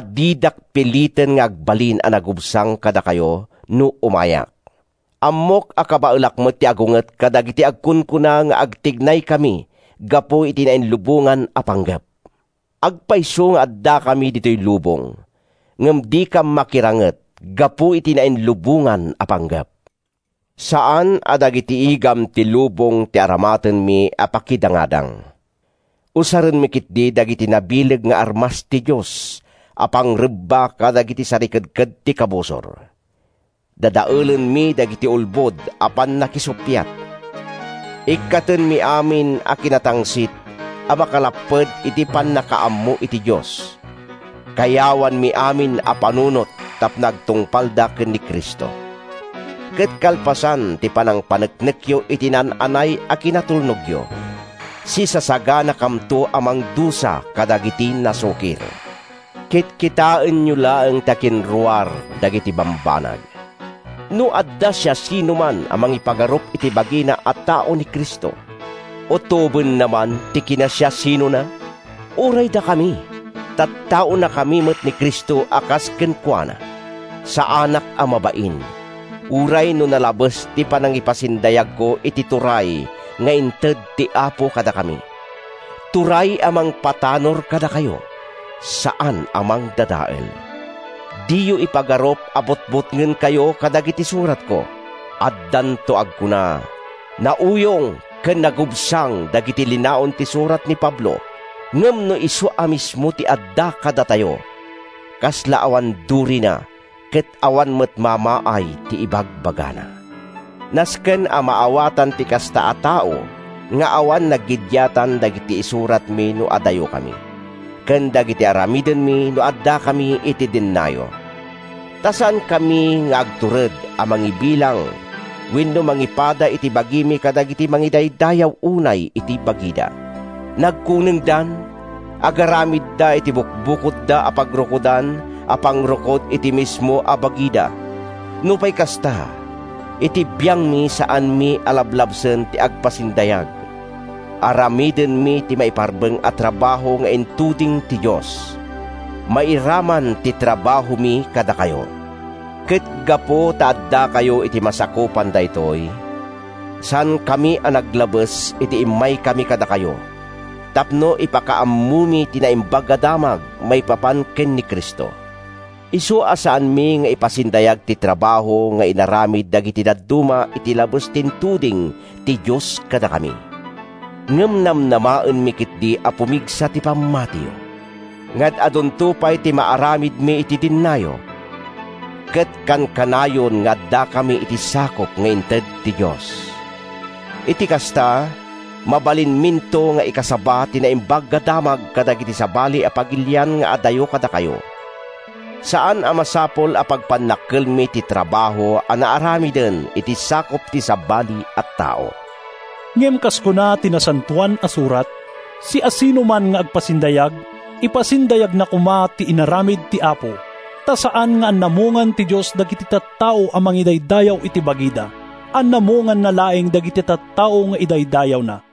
didak piliten nga agbalin a nagubsang kadakayo no umayak. Ammok a kabaelak met ti agunget kadagiti agkunkuna nga agtignaykami gapu iti nainlubongan a panggep. Agpayso nga addakami ditoy lubong, ngem dikam makiranget gapu iti nainlubongan a panggep. Saan a dagiti igam ti lubong ti aramatenmi a pakidangadang. Usarenmi ketdi dagiti nabileg nga armas ti Dios a pangrebba kadagiti sarikedked ti kabusor. Dadaelenmi dagiti ulbod a pannakisuppiat. Ikkatenmi amin a kinatangsit a makalapped iti pannakaammo iti Dios. Kayawanmi amin a panunot tapno agtungpalda ken ni Cristo. Ket kalpasan ti panangpaneknekyo iti naan-anay a kinatulnogyo, sisasaganakamto a mangdusa kadagiti nasukir. Kitkitaenyo laeng ti akinruar dagiti bambanag. No adda siasinoman a mangipagarup iti bagina a tao ni Cristo, utobenna man ti kinasiasinona? Uray dakami, tattaonakami met ni Cristo a kas kenkuana. Saanak a mabain, uray no nalabes ti panangipasindayagko iti turay nga inted ti Apo kadakami—turay a mangpatanor kadakayo, saan a mangdadael. Diyo ipagarup a butbutngenkayo kadagiti suratko. Addanto agkuna, “Nauyong ken nagubsang dagiti linaon ti surat ni Pablo ngem no isu a mismo ti adda kadatayo, kasla awan durina ket awan met mamaay ti ibagbagana.” Nasken a maawatan ti kasta a tao nga awan naggidiatan dagiti isuratmi no adayokami ken dagiti aramidenmi no addakami iti dennayo. Ta saankami nga agtured a mangibilang wenno mangipada iti bagimi kadagiti mangidaydayaw unay iti bagida. Nagkunengdan! Agaramidda iti bukodda a pagrukodan a pangrukod iti mismo a bagida. Nupay kasta, iti biangmi, saanmi a lablabsen ti agpasindayag. Aramidenmi ti maiparbeng a trabaho nga intuding ti Dios. Mairaman ti trabahomi kadakayo. Ket gapu ta addakayo iti masakupan daytoy, saankami a naglabes idi immaykami kadakayo tapno ipakaammomi ti Naimbag a Damag maipapan ken ni Cristo. Isu a saanmi nga ipasindayag ti trabaho nga inaramid dagiti dadduma iti labes ti intuding ti Dios kadakami. Ngem namnamaenmi ketdi a pumigsa ti pammatiyo, nga ad-adunto pay ti maaramidmi iti dennayo, ket kankanayon nga addakami iti sakup nga inted ti Dios. Iti kasta, mabalinminto nga ikasaba ti Naimbag a Damag kadagiti sabali a pagilian nga adayo kadakayo. Saan a masapul a pagpannakkelmi ti trabaho a naaramiden iti sakup ti sabali a tao. Ngem kas kuna ti Nasantoan a Surat, “Siasinoman nga agpasindayag, ipasindayagna koma ti inaramid ti Apo.” Ta saan nga anamongan ti Dios dagiti tattao a mangidaydayaw iti bagida. Anamonganna laeng dagiti tattao nga idaydayawna.